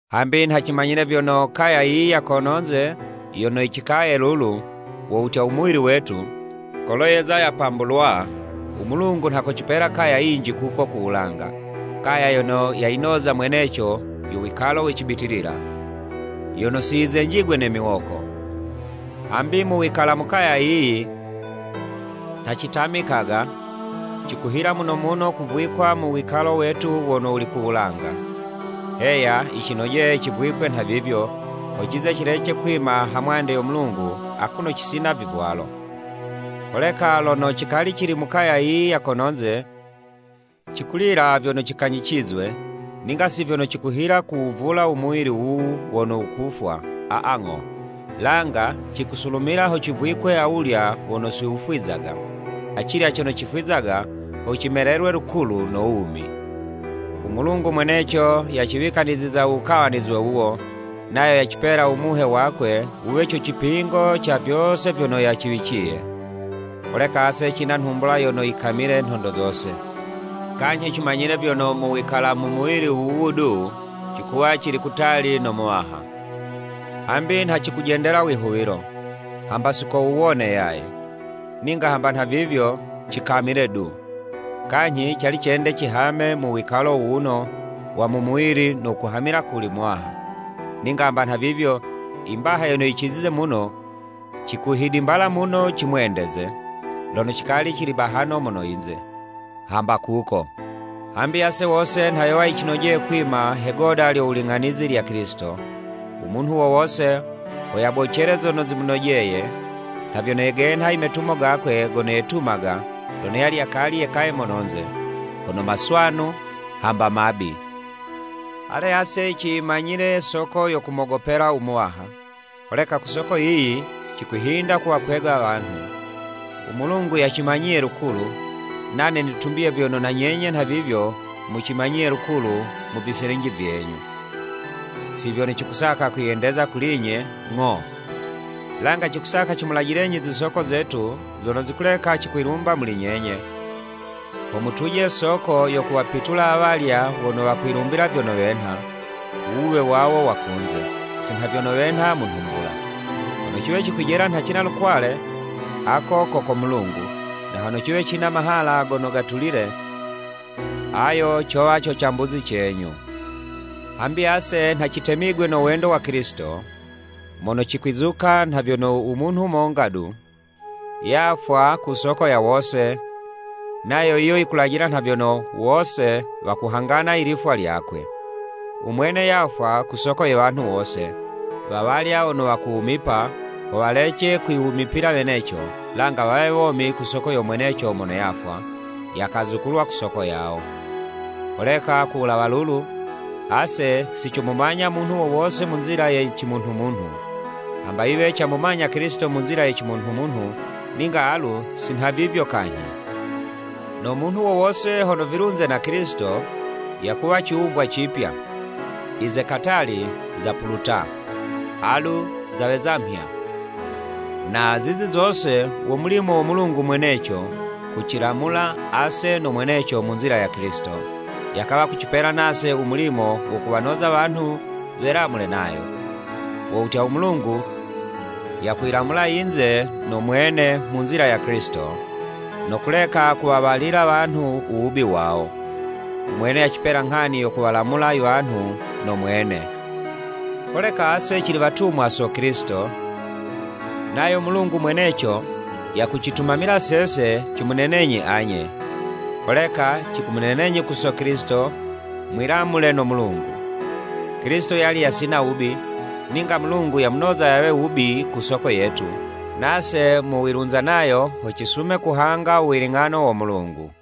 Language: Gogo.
Hambi nha cimanyile vyono, kaya yiyi ya kono'nze yono cikaye lulu, wo wutya u muwili wetu, kolo yeza yapambulwa, u Mulungu nha kocipela kaya yinji kuko ku wulanga, kaya yono yayinoza mweneco yo wikalo we cibitilila, yono si yizenjigwe ne miwoko. Hambi mu wikala u kaya yiyi, nha citamikaga, cikuhila muno muno kuvwikwa mu wikalo wetu wono wuli ku wulanga. Heya yicinojeye civwikwe nhavivyo, ho cize cilece kwima ha mwande yo Mulungu akuno cisina vivwalo. Holeka lono cikali cili mu kaya yiyi ya kono'nze, cikulila vyono cikanyicizwe, ninga si vyono cikuhila kuwuvula u muwili wuwu wono wukufwa, aa ng'o, langa cikusulumila ho civwikwe awulya wono si wufwizaga, acilya cono cifwizaga, ho cimelelwe lukulu no wumi. U Mulungu mweneco yaciwikaniziza u wukawanizwe wuwo, nayo yacipela u Muhe wakwe wuwe co cipingo ca vyose vyono yaciwiciye. Holeka ase cina nhumbula yono yikamile nhondo zose. Kanyhi cimanyile vyono mu wikala mu muwili wuwu du, cikuwa cili kutali no Muwaha. Hambi nha cikujendela wihuwilo, hamba si ko wuwone yaye. Ninga hamba nhavivyo, cikamile du. Kanyhi cali cende cihame mu wikalo wuwuno wa mu muwili no kuhamila kuli Muwaha. Ninga hamba nhavivyo, i mbaha yono yicizize muno, cikuhidimbala muno cimwendeze, lono cikali cili bahano mono yinze, hamba kuko. Hambi ase wose nha yowa yicinojeye kwima he'goda lyo wuling'anizi lya Kilisito, u munhu wo wose, ho yabocele zono zimunojeye, nha vyono genha i metumo gakwe gono yetumaga, lono yali yakali yekaye mononze, hono maswanu, hamba mabi. Ale, ase ciyimanyile soko yo kumogopela u Muwaha, holeka ku soko yiyi, cikwihinda kuwakwega wanhu. U Mulungu yacimanyiye lukulu, nane nitumbiye vyono na nyenye nhavivyo mucimanyiye lukulu mu viselinji vyenyu. Si vyono cikusaka kwiyendeza kuli'nye, ng'o, langa cikusaka cimulajilenyi zisoko zetu, zono zikuleka cikwilumbila muli nyenye, ho mutuje soko yo kuwapitula awalya wono wakwiyilumbila vyono wenha, u wuwe wawo wa kunze, si nha vyono wenha mu nhumbula. Hono ciwe cikwijela nha cina lukwale, ako ko ko Mulungu, na hono ciwe cina mahala gono gatulile, ayo cowa co cambuzi cenyu. Hambi ase nha citemigwe no wendo wa Kilisito, mono cikwizuka nha vyono u munhu monga du, yafwa ku soko ya wose, nayo yiyo yikulajila nha vyono, wose wakuhangana i lifwa lyakwe. Umwene yafwa ku soko ye wanhu wose, wawalya wono wakuwumipa, ho walece kwiwumipila weneco, langa wawe womi ku soko yo mwene mono yafwa, yakazukulwa ku soko yawo. Holeka ku wulawa lulu, ase si comumanya munhu wo wose mu nzila ye cimunhumunhu. Hamba yiwe camumanyila Kilisito mu nzila ye cimunhumunhu, ninga alu si nhavivyo kanyhi. No munhu wo wose hono vilunze na Kilisito, yakuwa ciwumbwa cipya, i ze katali zapuluta, alu zaweza mhya. Na zizi zose wo mulimo wo Mulungu mweneco kucilamula ase no mweneco mu nzila ya Kilisito, yakawa kucipela nase u mulimo wo kuwanoza wanhu welamule nayo. Wo wutya, u Mulungu yakuyilamula yinze no mwene mu nzila ya Kilisito, no kuleka kuwawalila wanhu u wubi wawo. Umwene yacipela nghani yo kuwalamula i wanhu no Mwene. Holeka ase cili watumwa so Kilisito, nayo Mulungu mweneco yakucitumamila sese, cimunenenyi anye. Holeka cikumunenenyi ku so Kilisito, mwilamule no Mulungu. Kilisito yali yasina wubi, ninga Mulungu yamunoza yawe wubi ku soko yetu, nase mu wilunza nayo, ho cisume kuhanga u wiling'ano wo Mulungu.